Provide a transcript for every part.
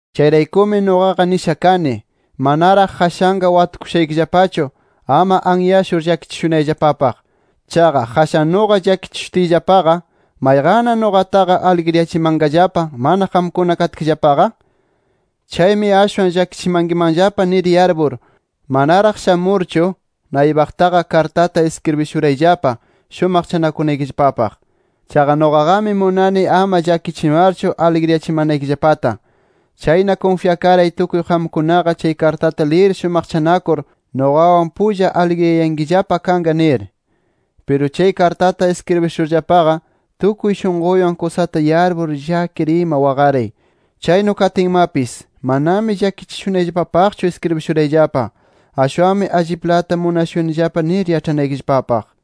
Chayraykumi nuqaqa nisha kani, manaraq qashanqa watukushaykillapachu, ama anyashur llakichishunayllapapaq. Chaqa qashan nuqa llakichishutiyllapaqa, ¿mayqanna nuqataqa aligriyachimanqallapa, mana qamkuna katkillapaqa? Chaymi ashwan llakichimankimanllapa nir yarpur manaraq shamurchu, naypaqtaqa kartata iskribishurayllapa shumaqchanakunaykillapapaq. Chaqa nuqaqami munani ama llakichimarchu aligrichimanaykillapata. Chayna kunfyakaray tukuy qamkunaqa chay kartata liyir shumaqchanakur nuqawan pulla aligriyayankillapa kanqa nir. Piru chay kartata iskribishurllapaqa, tukuy shunquywan kusata yarpur, llakir ima waqaray. Chaynu katinmapis, manami llakichishunayllapapaqchu iskribishurayllapa, ashwanmi alliplata munashunillapa nir yaĉhanaykillapapaq.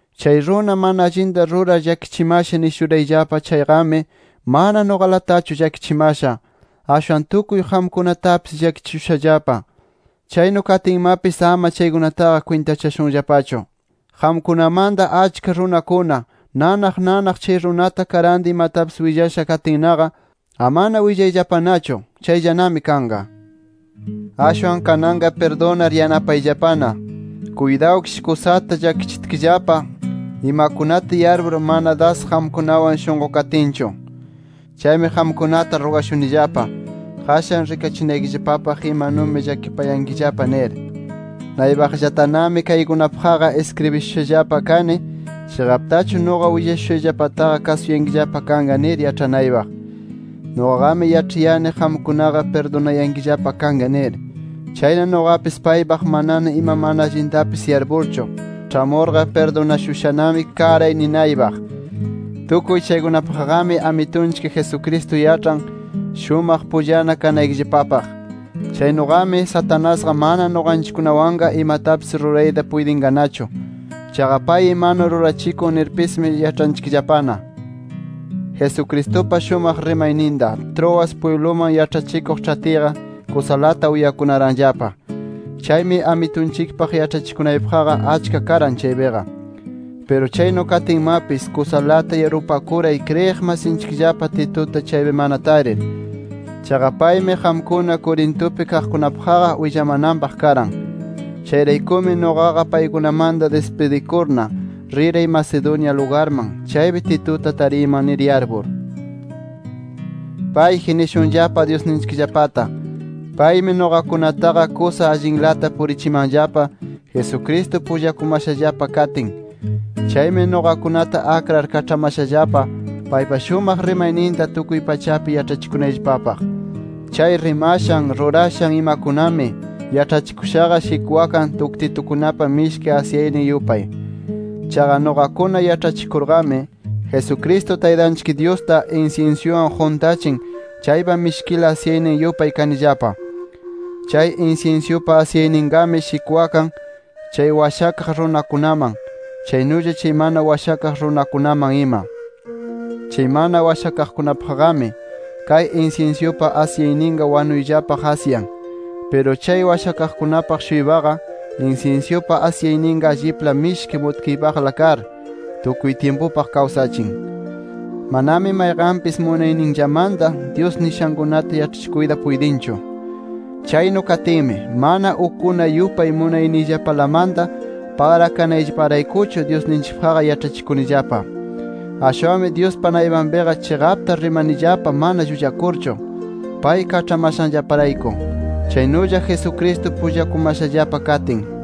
Chay runa mana allinta rurar llakichimasha nishurayllapa chayqami, mana nuqalatachu llakichimasha. Ashwan tukuy qamkunatapis llakichishushallapa. Chaynu katinmapis ama chaykunataqa kwintachashunllapachu. Qamkunamanta achka runakuna nanaq nanaq chay runata karanta imatapis willasha katinnaqa, amana willayllapanachu. Chayllanami kanqa. Ashwan kananqa pirdunar yanapayllapana. Kuytawkish kusata llakichitkillapa imakunata yarpur, mana das qamkunawan shunqukatinchu. Chaymi qamkunata rugashunillapa, qashan rikachinaykillapapaq imanumi llakipayankillapa nir. Naypaqllatanami kaykunapaqqa iskribishushallapa kani, chiqaptachu nuqa willashushayllapataqa kasuyankillapa kanqa nir yaĉhanaypaq. Nuqaqami yaĉhayani qamkunaqa pirdunayankillapa kanqa nir. Chayna nuqapis paypaq manana ima mana allintapis yarpurchu, ĉhamurqa pirdunashushanami karay ninaypaq. Tukuy chaykunapaqqami Amitunchik Jesucristo yaĉhan, shumaq pullana kanaykillapapaq. Chaynuqami, Satanasqa mana nuqanchikkunawanqa imatapis rurayta puytinqanachu. Chaqa pay imanu rurachikun nirpismi yaĉhanchikllapana. Jesucristupa shumaq rimayninta, Troas pwibluman yaĉhachikuq ĉhatiyqa, kusalata uyakunaranllapa. Chaymi Amitunchikpaq yaĉhachikunaypaqqa, achka karan chaypiqa. Piru chaynu katinmapis, kusalata yarpupakuray kriyiq masinchikllapa Tituta chaypi mana tarir. Chaqa paymi qamkuna Corintupi kaqkunapaqqa willamananpaq karan. Chayraykumi nuqaqa paykunamanta dispidikurna, riray Macedonia lugarman, chaypi Tituta tariyman nir yarpur. Payji nishunllapa Dyusninchikllapata. Paymi nuqakunataqa kusa allinlata purichimanllapa, Jesucristo pullakumashallapa katin. Chaymi nuqakunata akrar kaĉhamashallapa, paypa shumaq rimayninta tukuy pachapi yaĉhachikunayllapapaq. Chay rimashan rurashan imakunami, yaĉhachikushaqa shikwakan tuktitukunapa mishki asyaynin yupay. Chaqa nuqakuna yaĉhachikurqami, Jesucristo Taytanchik Dyusta insinsyuwan quntachin chaypa mishkila asyaynin yupay kanillapa. Chay insinsyupa asyayninqami shikwakan, chay washakaq runakunaman, chaynulla chay mana washakaq runakunaman ima. Chay mana washakaqkunapaqqami, kay insinsyupa asyayninqa, wanuyllapaq asyan. Piru chay washakaqkunapaq-shuypaqa, insinsyupa asyayninqa allipla mishki mutkiypaqla kar, tukuy tyimpupaq kawsachin. Manami mayqanpis munayninllamanta Dyus nishankunata yaĉhachikuyta puytinchu. Chaynu katinmi, mana ukkuna yupay munayniyllapalamanta pagrakanayllaparaykuchu Dyusninchikpaqqa yaĉhachikunillapa. Ashwanmi Dyuspa naypanpiqa chiqapta rimanillapa mana llullakurchu, pay kaĉhamashanllaparayku, chaynulla Jesucristo pullakumashallapa katin.